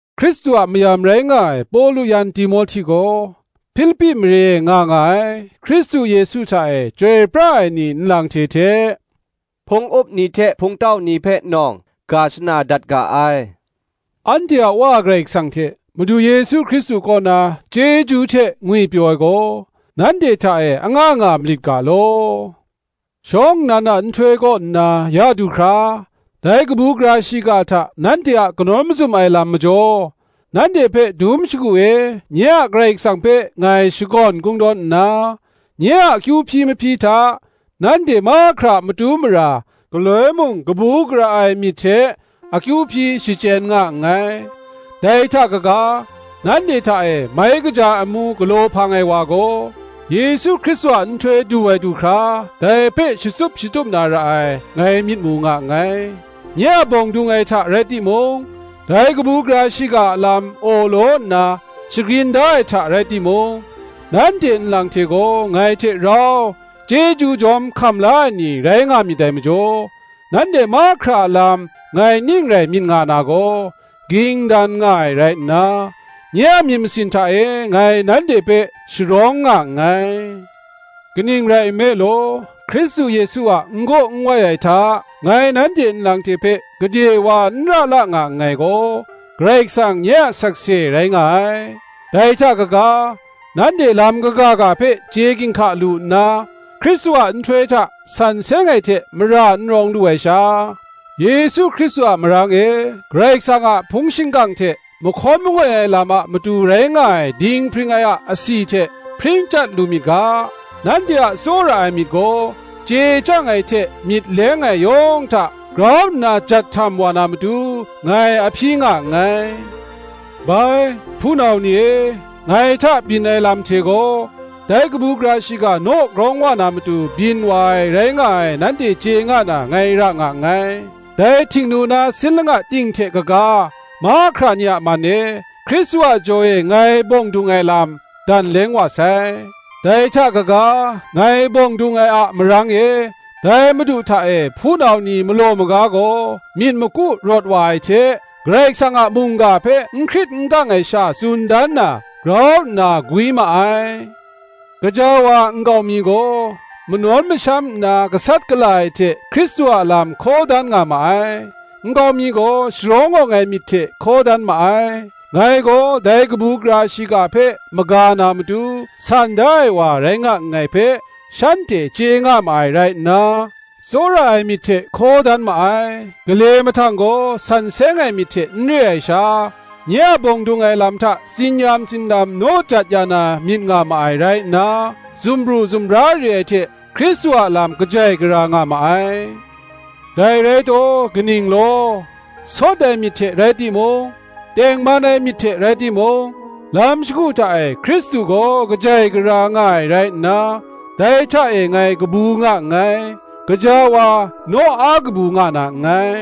Hkristu a mayam rai nga ai Pawlu yan Timohti gaw, Hpilipi mare e nga nga ai, Hkristu Yesu hta e chyoi pra ai ni nlang hte hte, hpung up ni hte hpungtau ni hpe nawng, ga shana dat ga ai. Anhte a Wa Karai Kasang hte Madu Yesu Hkristu kaw na, chyeju hte ngwipyaw ai gaw, nanhte hta e anga nga malit ga law. Shawng nnan a nhtoi kaw nna ya du hkra, dai kabu gara shiga hta nanhte a kanawn mazum ai lam majaw, nanhte hpe dum shagu e nye a Karai Kasang hpe ngai shakawn kungdawn nna, nye a akyu hpyi mahpyi hta, nanhte mahkra a matu mara galoi mung kabu gara ai myit hte akyu hpyi shachyen nga nngai. Dai hta kaga, nanhte hta e mai kaja ai amu galaw hpang ai wa gaw, Yesu Hkristu a nhtoi du ai du hkra dai hpe shatsup shatup na ra ai, ngai myit mu nga nngai. Nye a bawng dung ai hta rai timung, dai kabu gara shiga a lam awlaw nna shagrin da ai hta rai timung, nanhte nlang hte gaw ngai hte rau chyeju jawm hkam la ai ni rai nga myit dai majaw, nanhte mahkra a lam ngai ning rai myit nga na gaw, ging dan nga ai rai nna, nye a myit masin hta e ngai nanhte hpe sharawng nga nngai. Kaning rai nme law, Hkristu Yesu a n-gaw nwai ai hta ngai nanhte nlang hte hpe gade wa nra la nga nngai gaw, Karai Kasang nye a sakse rai nga ai. Dai hta kaga, nanhte lam kaga ga hpe chye ginhka lu nna, Hkristu a nhtoi hta san seng ai hte mara n rawng lu ai sha, Yesu Hkristu a marang e, Karai Kasang a hpung shingkang hte mahkawn mangoi ai lam a matu rai nga ai dinghpring ai a asi hte hpring chyat lu myit ga, nanhte a tsawra ai myit gaw chye chyang ai hte myit leng ai yawng hta grau nna jat htam wa na matu ngai a hpyi nga nngai. Bai, hpunau ni e, ngai hta byin ai lam hte gaw, dai kabu gara shiga naw grawng wa na matu byin wa ai rai nga ai, nanhte chye nga na ngai ra nga nngai. Dai htingnu na sin langa ting hte kaga, mahkra ni a man e, Hkristu a jaw e ngai bawng dung ai lam, dan leng wa sai: dai hta kaga, ngai bawng dung ai a marang e, dai Madu hta e hpunau ni malaw maga gaw, myit maku rawt wa ai hte, Karai Kasang a mungga hpe n hkrit n kang ai sha tsun dan na, grau nna gwi ma ai. Gaja wa nkau mi gaw, manawn masham nna gasat gala ai hte Hkristu a lam hkaw dan nga ma ai; nkau mi gaw sharawng awng ai myit hte hkaw dan ma ai. Ngai gaw dai kabu gara shiga hpe maga na matu, san da ai wa rai nga nngai hpe, shanhte chye nga ma ai rai nna, tsawra ai myit hte hkaw dan ma ai: gale mahtang gaw, san seng ai myit hte n re ai sha, nye a bawng dung ai lam hta tsin-yam tsindam naw jat ya na myit nga ma ai rai nna, dumbru dumbra re ai hte Hkristu a lam kajai gara nga ma ai. Dai rai taw, kaning law? Sawt ai myit hte rai timung, tengman ai myit hte rai timung, lam shagu hta e Hkristu gaw kajai gara nga ai rai nna, dai hta e ngai kabu nga nngai, gaja wa, naw a kabu nga na nngai: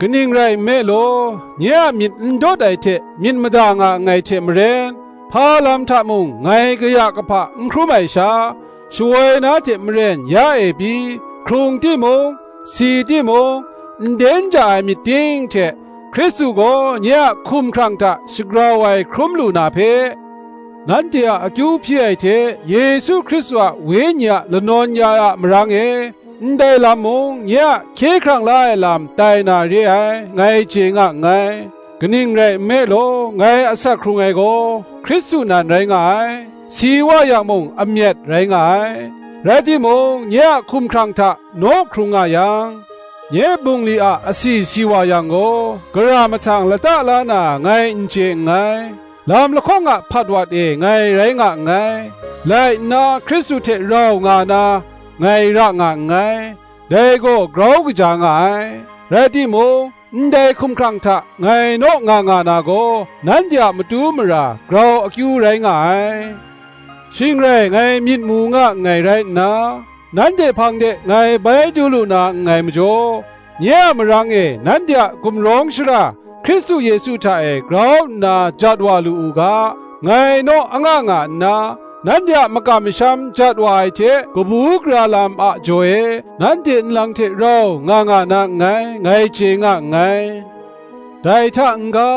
kaning rai nme law, nye a myit ndawt ai hte myit mada nga nngai hte maren, hpa lam hta mung ngai kaya kahpa n hkrum ai sha, shawoi na hte maren ya e pyi, hkrung timung, si timung, nden ja ai myit ting hte Hkristu gaw nye a hkumhkrang hta shagrau ai hkrum lu na hpe, nanhte a akyu hpyi ai hte Yesu Hkristu a Wenyi a lanawn ya ai a marang e, ndai lam mung nye a hkye hkrang la ai lam tai na re ai, ngai chye nga nngai. Kaning rai nme law, ngai asak hkrung ai gaw Hkristu nan rai nga ai, si wa yang mung amyat rai nga ai. Rai timung, nye a hkumhkrang hta naw hkrung nga yang, nye bungli a asi si wa yang gaw, gara mahtang lata la na ngai n chye nngai. Lam lahkawng a hpatwat e ngai rai nga nngai: lai nna Hkristu hte rau nga na, ngai ra nga nngai: dai gaw grau kaja nga ai; rai timung, ndai hkumhkrang hta ngai naw nga nga na gaw nanhte a matu mara grau akyu rai nga ai. Shing rai ngai myit mu nga nngai rai nna, nanhte hpang de ngai bai du lu na nngai majaw, nye a marang e nanhte a gumrawng shara Hkristu Yesu hta e grau nna jat wa lu u ga, ngai naw anga nga nna, nanhte a makam masham jat wa ai hte kabu gara lam a jaw e, nanhte nlang hte rau nga nga na nngai, ngai chye nga nngai. Dai hta n-ga,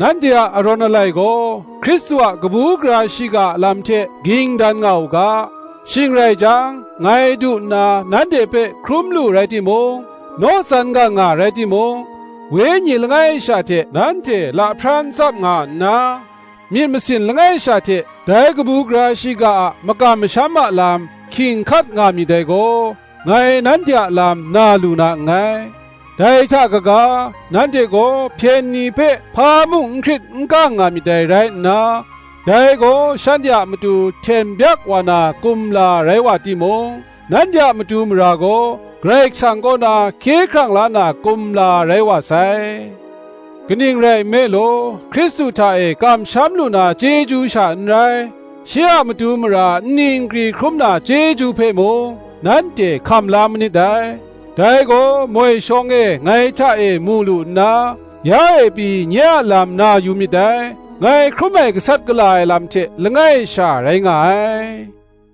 nanhte a arawn alai gaw Hkristu a kabu gara shiga a lam hte ging dan nga u ga: shing rai jang, ngai du nna nanhte hpe hkrum lu rai timung, naw tsan gang nga rai timung, Wenyi langai sha hte nanhte lahpran tsap nga nna, myit masin langai sha hte dai kabu gara shiga a makam masham a lam hkying hkat nga myit dai gaw, ngai nanhte a lam na lu na nngai: dai hta kaga, nanhte gaw hpyen ni hpe hpa mung n hkrit n kang nga myit dai rai nna, dai gaw shanhte a matu hten byak wa na kumla rai wa timung, nanhte a matu mara gaw Karai Kasang kaw na hkye hkrang la na kumla rai wa sai; kaning rai nme law, Hkristu hta e kamsham lu na chyeju sha n rai, shi a matu mara nni nkri hkrum na chyeju hpe mung, nanhte hkam la manit dai; dai gaw moi shawng e ngai hta e mu lu nna, ya e pyi nye a lam na yu myit dai, ngai hkrum ai gasat gala ai lam hte langai sha rai nga ai.